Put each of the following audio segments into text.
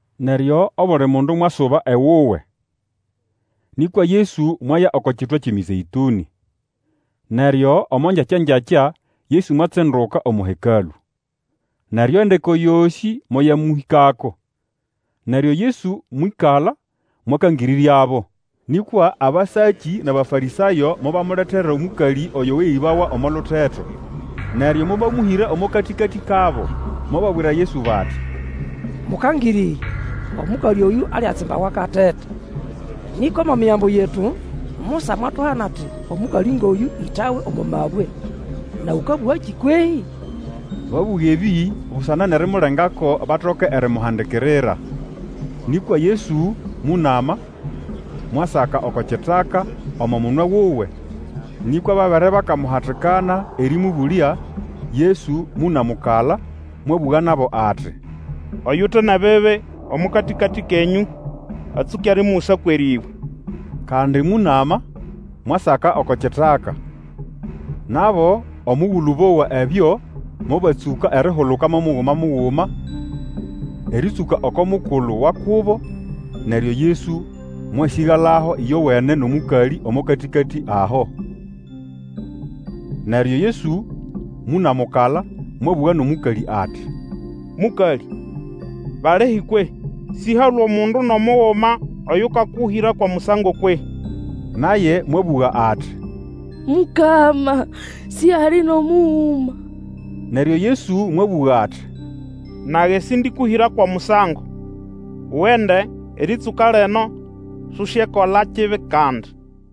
[ Neryo obuli mundu mwasuba ewuwe. Nĩkwa Yesu mwaya oko kitwa kyʼeMĩzeĩtũnĩ. Neryo omo ngyakyangyakya Yesu mwatsinduka omo Hekalũ. Neryo endeko yosĩ moyamũhĩkako, neryo Yesu mwĩkala mwakangĩrĩryabo. Nĩkwa abasakĩ nʼAbafarĩsayo mobamuletera omũkalĩ oyo weyĩbawa omo luteto. Neryo mobamũhĩra omo katĩkatĩ kabo. Mobabwira Yesu bati, Mũkangĩrĩrya, omũkalĩ oyũ aliatsimbawa akateta. Nĩkwa omo Migambo yetu, Musa mwatuhana ati omũkalĩ ngʼoyũ ĩtawe omo mabwe, nawe ũkabũgakĩ kwehĩ? Babũga ebĩ busana nʼerimulengako batoke erimuhandikirira. Nĩkwa Yesu mũnama, mwasaka oko kitaka omo munwe wuwe. Nĩkwa babere bakamuhatikana erĩmũbũlya, Yesu mũnamũkala, mwabũga nabo ati, Oyute nʼebibi omo katĩkatĩ kenyũ atsũke erimugusa kwʼerĩbwe. Kandi mũnama, mwasaka oko kitaka. Nabo omugulu bowa ekyo, mobatsũka erihuluka mo muguma muguma, erĩtsũka oko mukulu wa kubo, neryo Yesu mwasĩgalaho ĩyowene nʼomũkalĩ omo katĩkatĩ aho. Neryo Yesu mũnamũkala, mwabũga nʼomũkalĩ ati, Mũkalĩ, balihi kwehĩ? Sĩhalwe omundu nʼomuguma oyũkakũhĩra kwʼomusango kwehĩ? Naye mwabũga ati, Mukama, sihali nʼomuguma. Neryo Yesu mwabũga ati, Nage sĩndĩkũhĩra kwʼomusango. Ugende, erĩtsũka lino Susyekola kibi kandi.]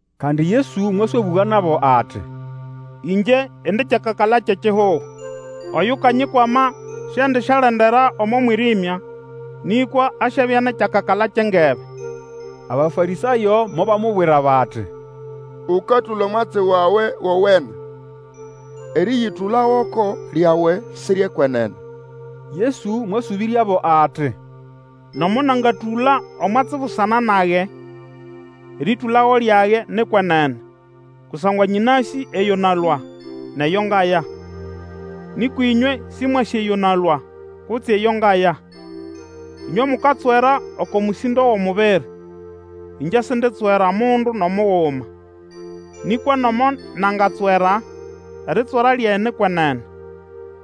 Kandi Yesu mwaswabũga nabo ati, Ingye indi kyakakala kyʼekihugo. Oyukanyikwama siendisyalendera omo mwĩrĩmya, nĩkwa asyabya nʼekyakakala kyʼengebe. Abafarĩsayo mobamubwira bati, Ũkatũla omwatsi wawe wowene; erĩyĩtũla goko lyawe si ryʼekwenene. Yesu mwasũbĩryabo ati, Nomo nangatũla omwatsi busana nage, erĩtũlago lyage ni kwenene, kusangwa nyĩnasĩ eyo nalũa, nʼeyo ngaya. Nĩkwa ĩnywe sĩmwasĩ eyo nalũa, kutse eyo ngaya. Ĩnywe mukatswera oko mũsĩndo wʼomubiri, Ingye Sinditswera mundu nʼomuguma. Nĩkwa nomo nangatswera, eritswera lyage ni kwenene,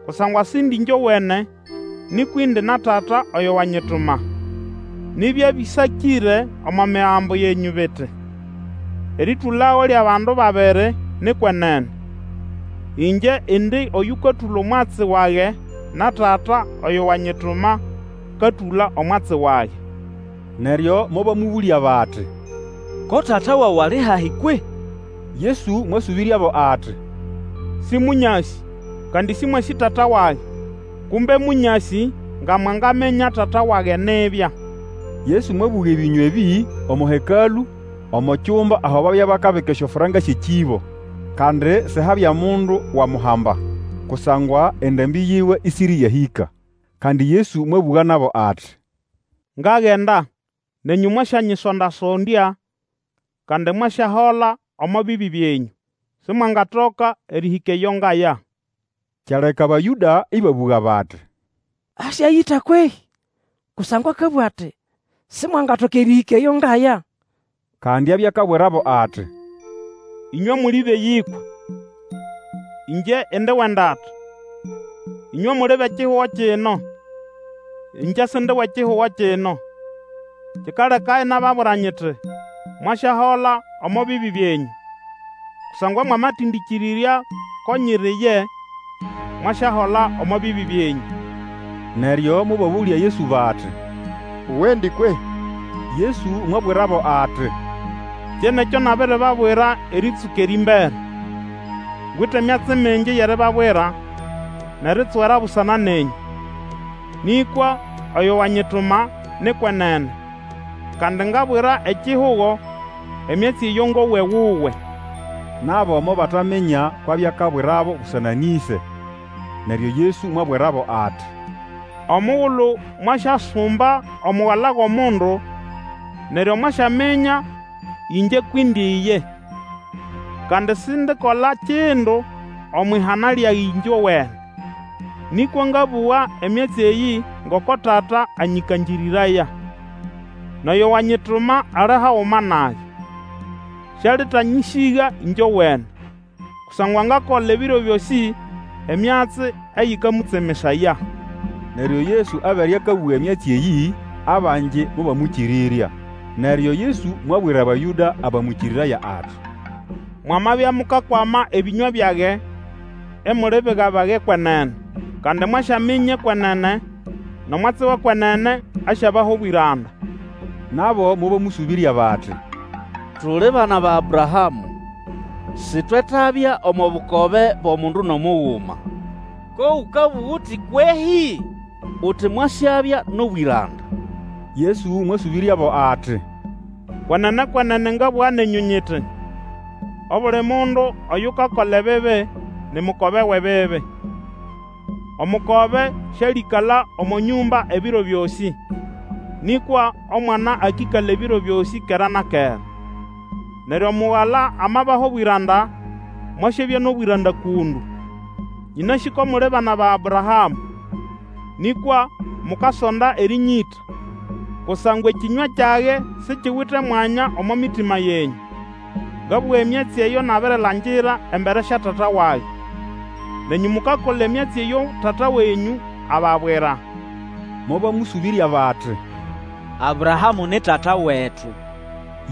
kusangwa Sindi ĩngyowene, nĩkwa indi na Tata oyo wanyituma. Nibya bĩsakĩre omo Migambo yenyũ biti, Erĩtũlago lyʼabandu babiri ni kwenene. Ĩngye indi oyũkatũla omwatsi wage, na Tata oyo wanyituma akatũla omwatsi wage. Neryo mobamũbũlya bati, Ko Tata wawe ali hahi kwehĩ? Yesu mwasũbĩryabo ati, Sĩmũnyasĩ, kandi sĩmwasĩ Tata wage. Kumbe mũnyasĩ, nga mwangaminya Tata wage nibya. Yesu mwabũga ebĩnywa ebĩ omo Hekalũ omo kyumba aho babya bakabika esyofranka syʼekĩbo. Kandi sihabya mundu wamuhamba, kusangwa endambĩ yiwe ĩsĩrĩyahĩka. Kandi Yesu mwabũga nabo ati, Ngagenda, nenyũ mwasyanyisonda-sondya, kandi mwasyahola omo bibi byenyũ. Simwangatoka erĩhĩka eyo ngaya. Kyaleka Abayũda ĩbabũga bati, Asyayĩta kwehĩ? Kusangwa akabũga ati, Simwangatoka erĩhĩka eyo ngaya. Kandi abya akabwirabo ati, Ĩnywe muli bʼeyĩkwa, ĩngye indi wʼendata; ĩnywe muli bʼekihugo kino, ĩngye Sindi wʼekihugo kino. Kikaleka inababwira nyiti, Mwasyahola omo bibi byenyũ. Kusangwa mwamatendĩkĩrĩrya ko nyiri ye, mwasyahola omo bibi byenyũ. Neryo mobabũlya Yesu bati, Uwendi kwehĩ? Yesu mwabwirabo ati, Kye nʼekyo nabiribabwira erĩtsũka erĩmbere. Ngwite myatsi mingi yʼeribabwira nʼeritswera busana nenyũ. Nĩkwa oyo wanyituma ni kwenene, kandi ngabwira ekihugo emyatsi eyo ngowa ewuwe. Nabo mobataminya kwʼabya akabwirabo busana nʼĩse. Neryo Yesu mwabwirabo ati, Omugulu mwasyasumba Omugala wʼOmundu, neryo mwasyaminya ĩngye kwʼindi ye. Kandi sindikola kindu omwʼihana lyage ĩngyowene, nĩkwa ngabũga emyatsi eyĩ ngoko Tata anyĩkangĩrĩraya. Nʼoyo wanyituma ali haguma nage. Sialitanyĩsĩga ĩngyowene, kusangwa ngakola ebiro byosĩ emyatsi eyĩkamũtsemesaya. Neryo Yesu abere akabũga emyatsi eyĩ, abangi mobamwĩkĩrĩrya. Neryo Yesu mwabwira Abayũda abamwĩkĩrĩraya ati, Mwamabya mukakwama ebĩnywa byage, imuli biga bage kwenene. Kandi mwasyaminya ekwenene, nʼomwatsi wʼekwenene asyabaha obwĩranda. Nabo mobamũsũbĩrya bati, Tuli bana ba Abrahamũ, sitwetabya omo bukobe bwʼomundu nʼomuguma. Ko ũkabũga uti kwehĩ? uti, Mwasyabya nʼobwĩranda. Yesu mwasũbĩryabo ati, Kwenene, kwenene ngabũga nenyũ nyiti, Obuli mundu oyukakola ebibi, ni mukobe wʼebibi. Omukobe sĩalĩkala omo nyũmba ebiro byosĩ, nĩkwa omwana akĩkala ebiro byosĩ kera na kera. Neryo Mugala amabaha obwĩranda, mwasyabya nʼobwĩranda kũndũ. Nyĩnasĩ ko muli bana ba Abrahamũ. Nĩkwa mukasonda erĩnyĩta, kusangwa ekĩnywa kyage sikiwite omwanya omo mitima yenyũ. Ngabũga emyatsi eyo nabirilangira embere sya Tata wage. Nenyũ mukakola emyatsi eyo tata wenyũ ababwira. Mobamũsũbĩrya bati, Abrahamũ ni tata wetu.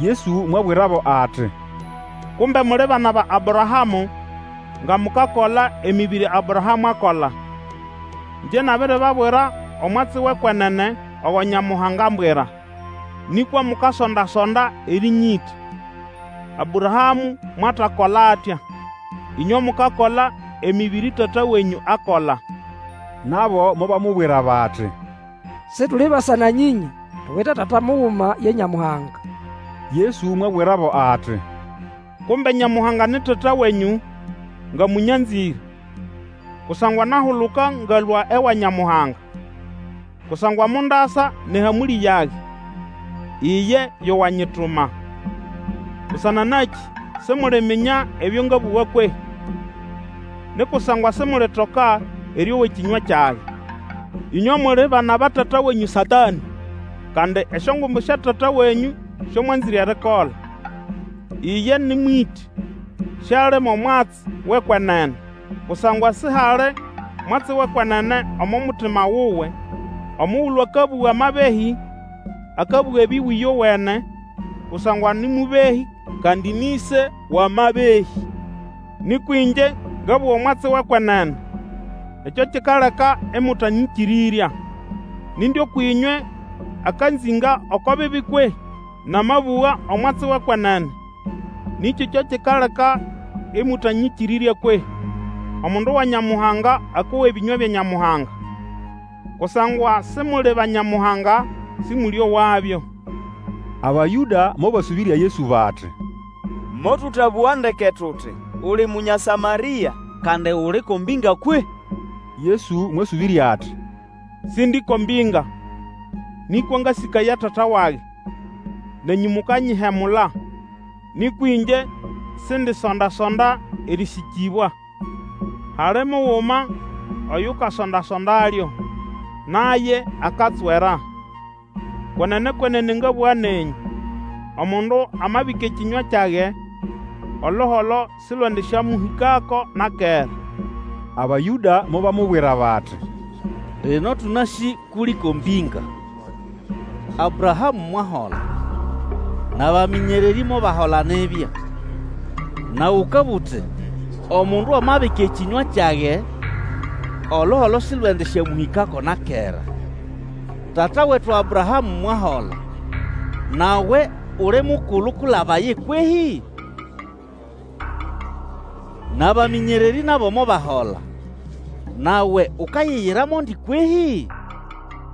Yesu mwabwirabo ati, Kumbe muli bana ba Abrahamũ, nga mukakola emĩbĩrĩ Abrahamũ akola. Ĩngye nabiribabwira omwatsi wʼekwenene ogo Nyamuhanga ambwira. Nĩkwa mukasonda-sonda erĩnyĩta. Abrahamũ mwatakola atya! Ĩnywe mukakola emĩbĩrĩ tata wenyũ akakola. Nabo mobamubwira bati, Situli basa-na-nyĩnya, tuwite tata muguma, ye Nyamuhanga. Yesu mwabwirabo ati, Kumbe Nyamuhanga ni Tata wenyũ, nga mũnyanzĩre; kusangwa nahuluka ngalũa ewa Nyamuhanga, kusangwa mondasa nʼehamũlĩ yage, iye yo wanyituma. Busana nakĩ simuliminya ebyo ngabũga kwehĩ? Ni kusangwa simulitoka erĩowa ekĩnywa kyage. Ĩnywe muli bana ba tata wenyũ Satanĩ, kandi esyongumbu sya tata wenyũ syo mwanzĩre erikola. Iye nĩ mwĩtĩ. Siali mo mwatsi wʼekwenene, kusangwa sihali mwatsi wʼekwenene omo mutima wuwe. Omugulu akabũga amabehĩ, akabũga ebiwe ĩyowene, kusangwa nĩ mũbehĩ, kandi nĩ ĩse wʼamabehĩ. Nĩkwa ĩngye ngabũga omwatsi wʼekwenene, ekyo kikaleka ĩmũtanyĩkĩrĩrya. Nindi ũkwʼĩnywe akanzĩnga oko bibi kwehĩ? Namabũga omwatsi wʼekwenene, nĩkĩ kyo kikaleka ĩmũtanyĩkĩrĩrya kwehĩ? Omundu wa Nyamuhanga akowa ebĩnywa bya Nyamuhanga. Kusangwa Simuli ba Nyamuhanga, sĩmũlĩowabyo. Abayũda mobasũbĩrya Yesu bati, Motũtabũga ndeke tuti, Uli Munya Samarĩa, kandi uli ko mbĩnga kwehĩ? Yesu mwasũbĩrya ati, Sindi ko mbĩnga, nĩkwa ngasĩkaya Tata wage, nenyũ mukanyihemula. Nĩkwa ĩngye sindisonda-sonda erĩsĩkĩbwa; hali muguma oyukasonda-sondalyo, naye akatswera. Kwenene, kwenene ngabũga nenyũ, omundu amabika ekĩnywa kyage, oluholo silwendisyamũhĩkako na kera. Abayũda mobamubwira bati, Lino tũnasĩ kʼuli ko mbĩnga. Abrahamũ mwahola, nʼabamĩnyererĩ mobahola nibya; nawe ũkabũga uti, Omundu amabika ekĩnywa kyage, oluholo sĩlwendĩsyamũhĩkako na kera. Tata wetu Abrahamũ mwahola, nawe uli mukulu kwilaba ye kwehĩ? Nʼabamĩnyererĩ nabo mobahola, nawe ukayiyira mondi kwehĩ?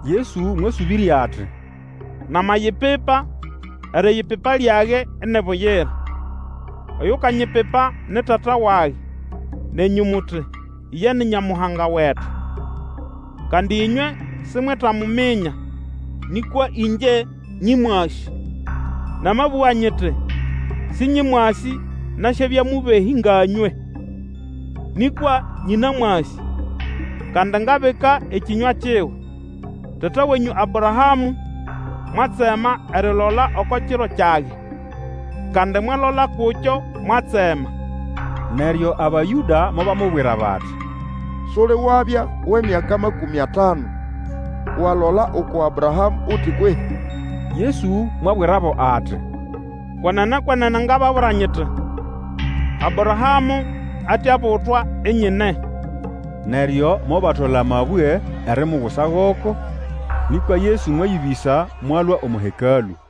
Yesu mwasũbĩrya ati, Namayipipa, eriyipipa lyage ini buyira. Oyukanyipipa ni Tata wage, nenyũ muti, Iye ni Nyamuhanga wetu. Kandi ĩnywe simwetamuminya, nĩkwa ĩngye nyĩmwasĩ. Namabũga nyiti, sĩnyĩmwasĩ, nasyabya mũbehĩ nga nywe. Nĩkwa nyĩnamwasĩ, kandi ngabika ekĩnywa kiwe. Tata wenyũ Abrahamũ mwatsema erilola oko kiro kyage, kandi mwalola kukyo, mwatsema. Neryo Abayũda mobamubwira bati, Suli wabya wʼemyaka makũmĩ atanu, walola uku Abrahamũ uti kwehĩ? Yesu mwabwirabo ati, Kwenene, kwenene ngababwira nyiti, Abrahamũ ate abutwa, INYINE. Neryo mobatola amabwe erimugusa goko; nĩkwa Yesu mwayĩbĩsa, mwalũa omo Hekalũ.